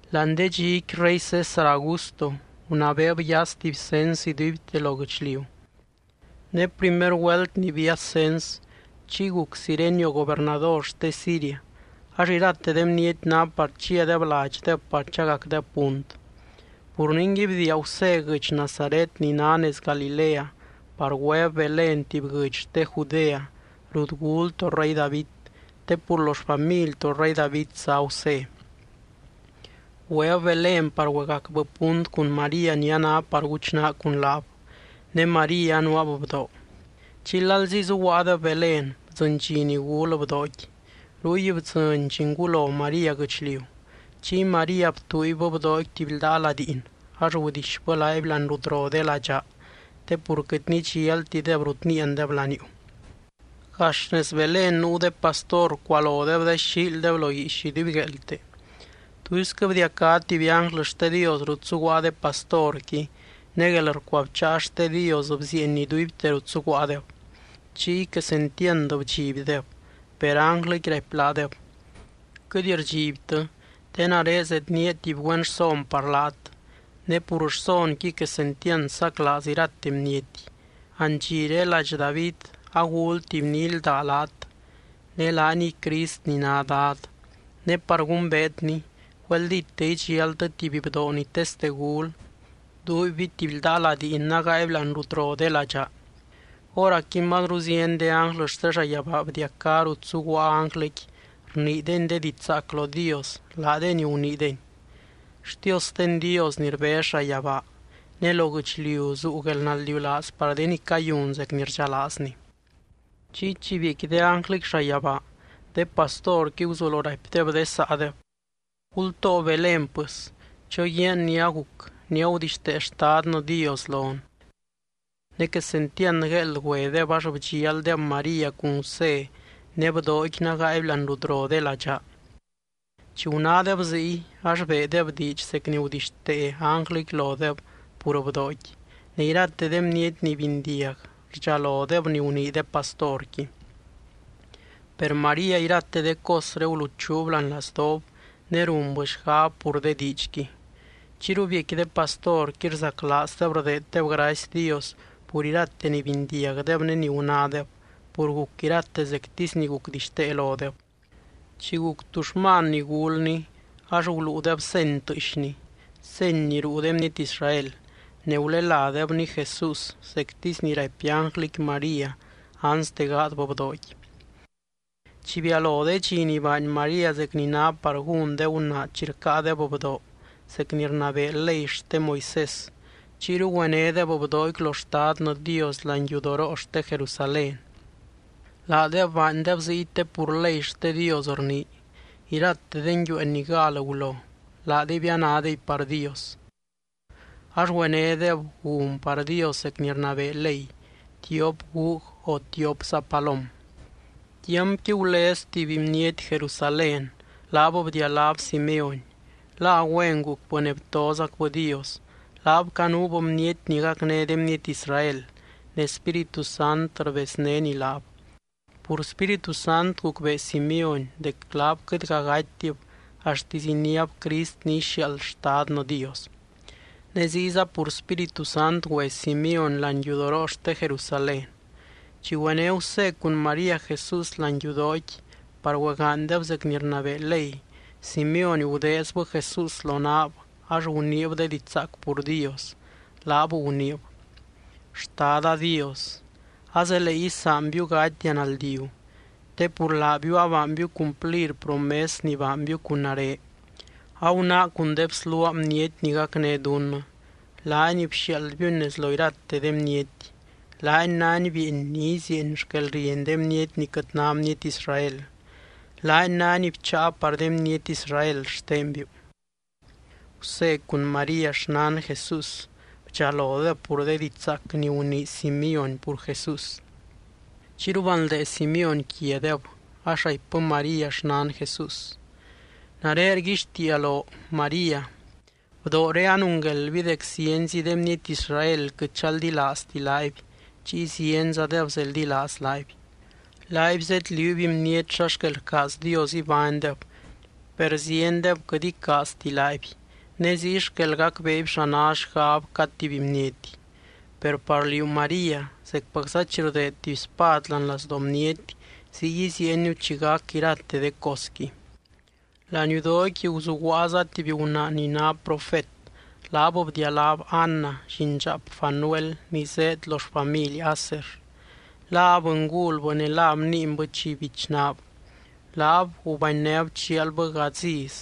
Láani de dxiqui rey César Augusto gunabeeb yas tuby cens iduibte lo guɨchliu. Ne primer güelt ni bias cens, chiy guc Cirenio gobernador xte Siria. Ax irate de bniety ná par chiadeb ladxdeb par chagacdeb punt. Pur ningui, bdiia Gusé guɨdx Nazaret ni ná nez Galilea par güeb Belén tuby guɨdx xte Judea, rut gul to rey David, te pur lo xfamily to rey David zá Gusé. Güeb Belén par güegacbɨ punt cun María ni a ná par guchnaa cun laab. Ne María anuaab bdoo. Chiy lalzi zuguaadeb Belén bdzɨny dxi ni gul bdooqui. Ruy bdzɨny llingulo María guɨchliu. Chiy María btuuibbɨ bdooqui tuby ldaa ladiin, ax gudixbɨ laaby láani rut ro de ladxaa te pur quɨt nidxialtideb rut níiandeb laniuu. Gax nez Belén nuu de pastor rcualodeb de xíildeb lo guiix idubygueelte. Tuisquɨ bdiacá tuby ánglɨ xte Dios rut zuguaa de pastorqui ne guelrcuabcháa xte Dios bzieeny iduibte rut zuguaadeb. Chiy quesentiand bdxibdeb. Per ánglɨqui raipy laadeb: —Quɨt rdxibtɨ te nare zednía tuby güen rson par laat, ne pur rsonqui quesentiand saclaaz irate bniety: andxiré ladx David agul tuby ni ílda laat, ne laaniy CRIST ni ná Dad. Ne par gumbeetny, güeldíte idxialtɨ tuby bdoo ni teste gul, duuibby tuby ldaa ladiin nágaaby láani rut ro de ladxaa. Hóracqui mazru zieny de ánglɨ xte llayabaa bdiacá rut zuguaa ánglɨqui rniideny de diidx zaac lo Dios, laadeny guniideny: ¡Xtiosten Dios ni rbez llayabaa, ne lo guɨchliu zuu guelnaldiulaaz par de ni cayun zec ni rdxalaazny! Chiy chi biecqui de ánglɨqui llayabaa, de pastorqui guzulo raipdeb de saadeb: —Gultoo Belén, pɨs, choguiaan ni aguc ni agudixtee Xtadnɨ Dios lon. Ne quesentiand gueeld güedeb ax bdxialdeb María cun Gusé, ne bdooqui nágaaby láani rut ro de ladxaa. Chi gunádeb ziy, ax beedeb diidx zec ni gudixtee ánglɨqui lodeb pur bdooqui, ne irate de bniety ni bindiag rdxalodeb ni gunii de pastorqui. Per María irate de cosré guluchuub láani lazdoob, ne runbɨ xgab pur de diidxqui. Chiyru biecqui de pastorqui rzaclaazdeb rdeeddeb gracy Dios pur irate ni bindiagdeb ne ni gunádeb, pur guc irate zectisy ni gucdixtee lodeb. Chi guc tuxman ni gulny ax guluudeb seny tɨɨxny, seny ni ruu de bniety Israel, ne guleládebny JESÚS zectisy ni raipy ánglɨqui María anste gaadbɨ bdooqui. Chi bialo de dxi ni baany María zec ni ná par gún de gunaa chi rcáadeb bdoo zec ni rnabee ley xte Moisés, chiyru güenédeb bdooqui lo Xtadnɨ Dios láani yudoroo xte Jerusalén. (Laadeb baandeb ziy te pur ley xte Dios rnii: “Irate de nguiueen ni gal gulo, laadeby anádeby par Dios.”) Ax güenédeb gun par Dios zec ni rnabee ley, tiop gug o tiopza palom. Tiampqui gulez tuby bniety Jerusalén, laab bdialáb Simeóny. La güen gucbɨ, ne btozacbɨ Dios. Laab canuub bniety ni gacné de bniety Israel. Ne Spíritu Sant rbeznény laab. Pur Spíritu Sant gucbee Simeóny dec laab quɨtga gatytib axtisy iniáb Crist ni ixiaald Xtadnɨ Dios. Ne ziyza pur Spíritu Sant güe Simeóny láani yudoroo xte Jerusalén. Chi güené Gusé cun María Jesús láani yudooqui par güegaanydeb zec ni rnabee ley, Simeóny gudeezbɨ Jesús lonaab ax guniib de diidx zaac pur Dios, laab guniib: Xtada Dios, azelee isaanbiu gatia naldiu, te pur laabiu abaanbiu cumplir promes ni baanbiu cun nare. Agunáa cun de bsluaa bniety ni gacné dunnɨ, laany bxiaaldbiuny nez lo irate de bniety. Laany nány bieeny ni izieeny xquelrieny de bniety ni quɨt ná bniety Israel. Laany nány bcháa par de bniety Israel xtenbiu. Gusé cun María xnan Jesús bdxalodeb pur de diidx zaac ni gunii Simeóny pur Jesús. Chiyru banldee Simeóny quiadeb, ax raipbɨ María xnan Jesús: —Nare rguixtiia loo, María, bdooré anungueldby dec zienzi de bniety Israel quɨt chaldilaazti laaby chiy zienzadeb zeldilaaz laaby. Laaby zedliuuby bniety xa xquel rcaaz Dios ibánybdeb, per ziendeb quɨt icaazti laaby ne ziy xquel gacbeeby xa ná xgab cad tuby bniety. Per par liú, María, zecpacza chi rdeed tuby spad láani lazdoo bniety ziy iziieniu chi gac irate de cosqui. Láani yudooqui guzuguaaza tuby gunaa ni ná profet. Laab bdialáb Ana, llindxaap Fanuel, ni zéed lo xfamily Aser. La abɨngulbɨ ne la bniinbɨ chi bichnaab. Laab gubanynéb chialbɨ gadz iz,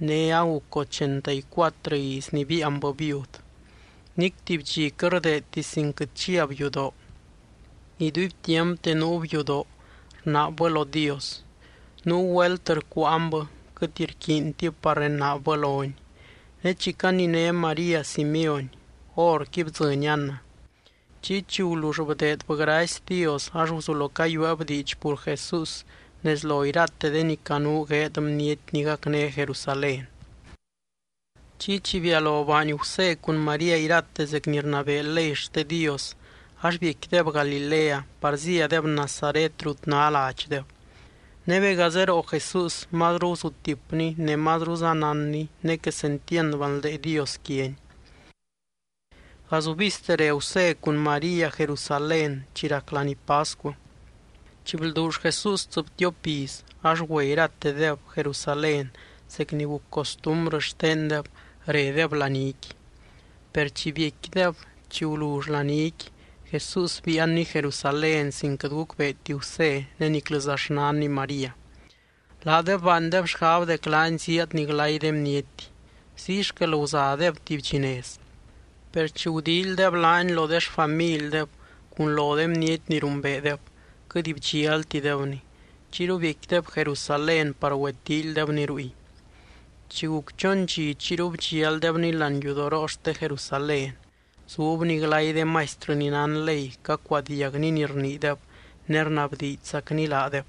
ne aguc ochenta y cuatrɨ iz ni biianbɨ viud. Nic tuby dxi quɨt rdeedti sin quɨt chiab yudoo, iduibtiampte nuub yudoo rnaabbɨ lo Dios. Nuu güelt rcuuanbɨ, quɨt rquiintib par renaabbɨ lony. Ne chi caniné María Simeóny, horqui bdzɨny Ana. Chiy chi gulull bdeedbɨ gracy Dios ax guzulo cayueeb diidx pur Jesús nez lo irate de ni canuu gueed bniety ni gacné Jerusalén. Chiy, chi bialo baany Gusé cun María irate zec ni rnabee ley xte Dios, ax biecquideb Galilea par zíadeb Nazaret rut ná ladxdeb. Ne bega zeroo Jesús mazru guzutipny, ne mazruza nánny ne quesentiand banldee Dios quiany. Gazubizte re Gusé cun María Jerusalén chi rac laní pascu. Chi blduull Jesús tsɨbtiop iz ax güe iratedeb Jerusalén zec ni guc costumbrɨ xtendeb redeb laníqui. Per chi biecquideb, chi gulull laníqui, Jesús biianny Jerusalén, sin quɨt gucbeeti Gusé ne niclɨza xnanny María. Laadeb baandeb xgab dec laany zíadny glay de bniety, ziy xquel guzadeb tuby dxi nez. Per chi gudíilydeb laany lo de xfamildeb cun lo de bniety ni rumbeedeb, quɨt bdxialtidebny. Chiyru biecquideb Jerusalén par güetíilydebny ruy. Chi guc chon dxi chiyru bdxialdebny láani yudoroo xte Jerusalén. Zubny glay de maistrɨ ni nán ley, cacuadiagny ni rniideb ne rnabdiidxzacny laadeb.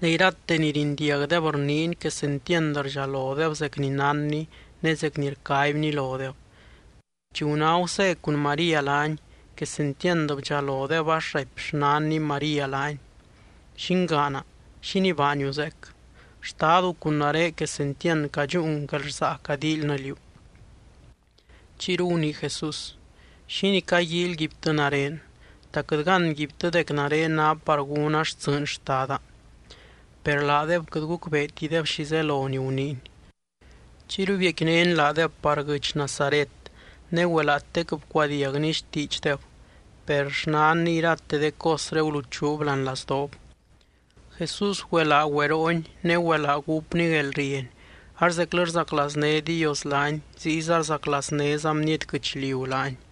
Ne irate ni rindiagdeb rniiny quesentiand rdxalodeb zec ni nánny ne zec ni rcaibny lodeb. Chi guná Gusé cun María laany, quesentiand bdxalodeb ax raipy xnanny María laany: —Llingaana, ¿xínii baaniu zeec? Xtadu cun nare quesentiand cadxúun guelrsaa cadíilynɨ liú. Chiyru gunii Jesús: —¿Xínii caguíilyguibtɨ nare? ¿Ta quɨt gánguibtɨ dec nare ná par gúna xtsɨɨny Xtada? Per laadeb quɨt gucbeetideb xi zelo ni guniiny. Chiyru biecquinény laadeb par guɨdx Nazaret, ne güelaatec bcuadiagny xtiidxdeb. Per xnanny irate de cosré guluchuub láani lazdoob. Jesús güelaa güeroony ne güelaa gúpny guelrieny ax zeclɨ rzaclaazné Dios laany ziyza rzaclaaznéza bniety guɨchliu laany.